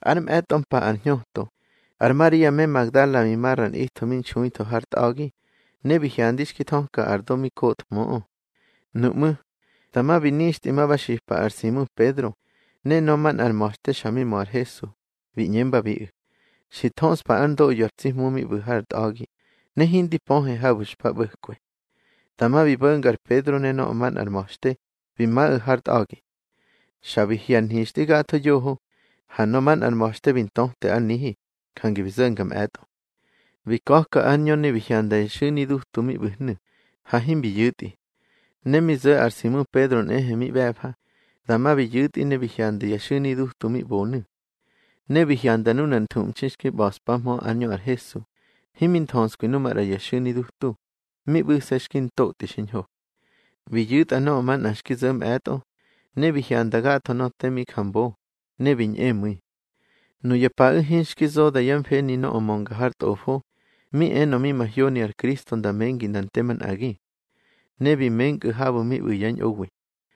Ár mꞌe̱tꞌo mpa ar hñöto, ar Maria me Magdala bi ma ra nꞌitho mi nxuitho har tꞌa̱gi, ne bi hyandi xki thöka ar do mi kothmöꞌö. Nuꞌmú̱, dama bi nixtꞌi ma ba xipa ar Simu Pedro ne nöꞌö manꞌar ma̱xte xa mi mö ar Hesu, bi ꞌñembabiꞌu̱: —Xi thöꞌspa ár ndoꞌyo ar tsi Hmu mi ꞌbu̱ har tꞌa̱gi, ne hindi pöhe habu̱ xpa ꞌbo̱kwe. Dama bi bo̱nga ar Pedro ne nöꞌö manꞌar ma̱xte, bi maꞌu̱ har tꞌa̱gi. Xa bi hye̱ ar nhixtꞌi gatho yoho, ha nöꞌö manꞌar ma̱xte bi ntöte ár nihi, jange bi zo̱nga mꞌe̱tꞌo. Bi ka̱ka ár ñö ne bi hyanda ya xu̱ni dutu mi ꞌbu̱hnu̱, ha himbi yu̱tꞌi. Ne mi zo̱ ar Simu Pedro nꞌehe mi ꞌbe̱fa, dama bi yu̱tꞌi ne bi hyanda ya xu̱ni dutu mi ꞌbonu̱. Ne bi hyanda nunar nthuꞌmxi xki ꞌba̱ꞌspahmö ár ñö ar Hesu, himi nthöskwi nu maꞌra ya xu̱ni dutu, mi ꞌbu̱se̱ xki ntotꞌi xiñho. Bi yu̱tꞌa nöꞌö manꞌa xki zo̱ mꞌe̱tꞌo, ne bi hyanda gatho nöꞌö te mi ja mbo, ne bi ñꞌemu̱i. Nuya paꞌu̱ hinxki zoda yá mfeni nöꞌö mönga har Tꞌofo, mi enö mi mahyoni ar Kristo nda mengi nda nte manꞌagi. Ne bi menkꞌu̱ habu̱ mi ꞌbu̱ yá ñꞌowi.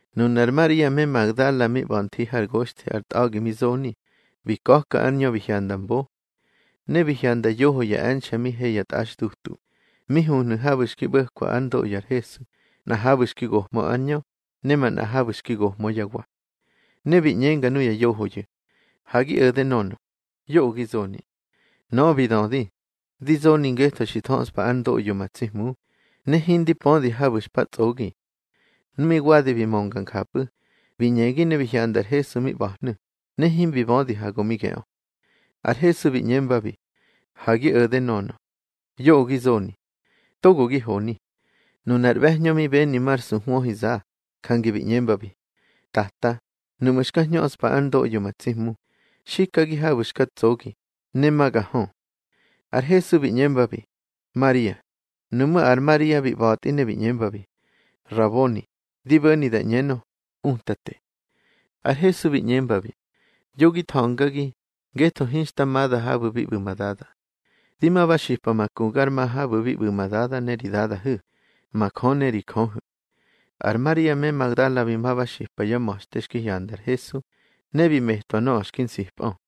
Nunar Maria me Magdala mi ꞌba̱ nthi hár goxthi ar tꞌa̱gi mi zoni, bi ka̱ka ár ñö bi hyanda mbo. Ne bi hyanda yoho ya e̱nxe̱ mi he ya tꞌaxdutu, mi huhnu̱ habu̱ xki ꞌbo̱kwa ár ndoꞌyo ar Hesu, nꞌa habu̱ xki gohmö ár ñö, ne manꞌa habu̱ xki gohmö yá wa. Ne bi ꞌñenga nuya yohoyu̱: —Ha gi o̱de nönö. Yoꞌö gi zoni. Nöꞌö bi dödi: —Di zoni ngetho xi thöꞌspa ár ndoꞌyo ma tsi Hmu, ne hindi pödi habu̱ xpa tsꞌogi. Nu mi wadi bi mönga njapꞌu̱, bi ñegi ne bi hyanda ar Hesu mi ꞌba̱hnu̱, ne himbi bödi ha go mi geꞌö. Ar Hesu bi ꞌñembabi: —Ha gi o̱de, nönö. Yoꞌö gi zoni. Togo gi honi. Nunar ꞌbe̱hñö mi beni mar suhwöhiza, jange bi ꞌñembabi: —Tata, nuꞌmu̱ xka hñöꞌspa ár ndoꞌyo ma tsi Hmu, xikagi habu̱ xka tsogi, ne ma ga hö. Ar Hesu bi ꞌñembabi: —Maria. Nuꞌmú̱ ar Maria bi ꞌba̱tꞌi ne bi ꞌñembabi: —Raboni (di bo̱ni da ꞌñenö, Utate). Ar Hesu bi ꞌñembabi: —Yo gi tha̱ngagi, ngetho hinxta mada habu̱ bi ꞌbu̱ ma Dada. Di ma ba xipa ma ku gar ma habu̱ bi ꞌbu̱ ma Dada ne ri Dadahu̱, ma Jö ne ri Jöhu̱. Ar Maria me Magdala bi ma ba xipa yá ma̱xte xki hyanda ar Hesu, ne bi metwa nöꞌö xki nsipꞌö.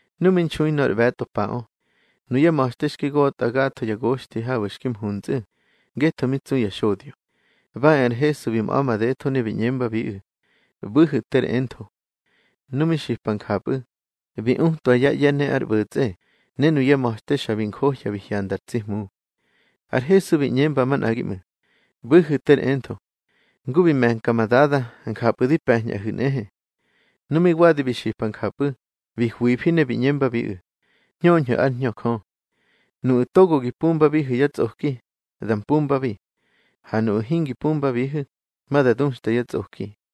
Nu mi nxui nor ꞌbe̱tꞌo paꞌö, nuyá ma̱xte xki gotꞌa gatho ya goxthi habu̱ xki mhusꞌu̱ ngetho mi tsu ya xodyo, ba e ar Hesu bi mꞌa̱ madetho, ne bi ꞌñembabiꞌu̱: —ꞌBu̱hu̱ ter entho. Nu mi xipa njapꞌu̱, bi utwa yá ꞌye̱ ne ár ꞌbo̱tsꞌe, ne nuyá ma̱xte xa bi njohya bi hyanda ar tsi Hmu. Ar Hesu bi ꞌñemba manꞌagi ꞌmu̱: —ꞌBu̱hu̱ ter entho. Ngu bi me̱nka ma Dada, njapꞌu̱ di pe̱ñꞌahu̱ nꞌehe. Nu mi wadi bi xipa njapꞌu̱, bi hwifi ne bi ꞌñembabiꞌu̱: —Hñöñhu̱ ár Hñö Jö. Nuꞌu̱ togo gi pumbabihu̱ yá tsꞌoki, da mpumbabi. Ha nuꞌu̱ hingi pumbabihu̱, ma da duxta yá tsꞌoki.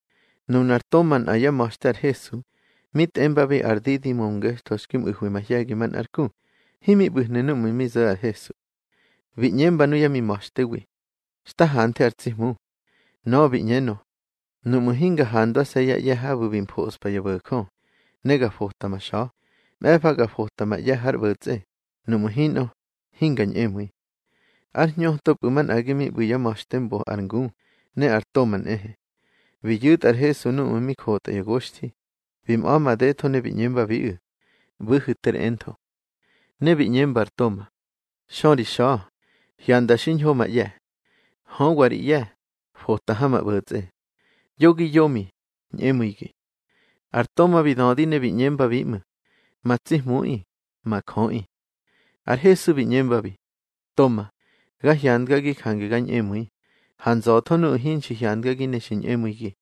Nunar Toma nꞌa yá ma̱xte ar Hesu, mi tꞌembabi ar Didimo ngetho xki mꞌu̱hwi mahye̱gi manꞌár ku, himi ꞌbu̱hnu̱ núꞌmu̱ mi zo̱ ar Hesu. Bi ꞌñemba nuyá mi ma̱xtewi: —Xta hanthe ar tsi Hmu. Nöꞌö bi ꞌñenö: —Nuꞌmu̱ hinga handwase̱ yá ꞌye̱ habu̱ bi mfoꞌspa ya bo̱jö, ne ga fota ma xa̱, mꞌe̱fa ga fota ma ꞌye̱ hár ꞌbo̱tsꞌe, nuꞌmu̱ hinꞌö, hinga ñꞌemu̱i. Ár hñötopꞌu̱ manꞌagi mi ꞌbu̱ yá ma̱xte mbo ar ngu, ne ar Toma nꞌehe. Bi yu̱tꞌa ar Hesu núꞌmu̱ mi jotꞌa ya goxthi, bi mꞌa̱ madetho ne bi ꞌñembabiꞌu̱: —ꞌBu̱hu̱ ter entho. Ne bi ꞌñemba ar Toma: —Xö ri xa̱, hyandga xiñho ma ꞌye̱. Höwa ri ꞌye̱, fota ha ma ꞌbo̱tsꞌe. Yo gi yomi, ñꞌemu̱igi. Ar Toma bi dödi ne bi ꞌñembabi ꞌmu̱: —Ma tsi Hmuꞌi, ma Jöꞌi. Ar Hesu bi ꞌñembabi: —Toma, ga hyandgagi jange ga ñꞌemu̱i. Ha nza̱tho nuꞌu̱ hinxi hyandgagi ne xi ñꞌemu̱igi.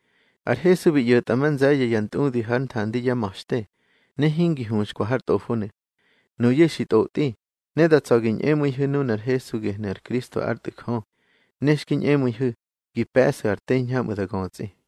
Ar Hesu bi ꞌyo̱tꞌa ma nze̱ye̱ ya ntꞌudi hár nthandi yá ma̱xte, ne hingi huxkwa har tꞌofonu̱. Nuyu̱ xi tꞌotꞌi, ne da tsa̱ gi ñꞌemu̱ihu̱ nunar Hesu gehnu̱ ar Kristo ár Tꞌu̱ Jö, ne xki ñꞌemu̱ihu̱ gi pe̱ꞌsu̱ ar te hiñhamꞌu̱ da götsꞌi.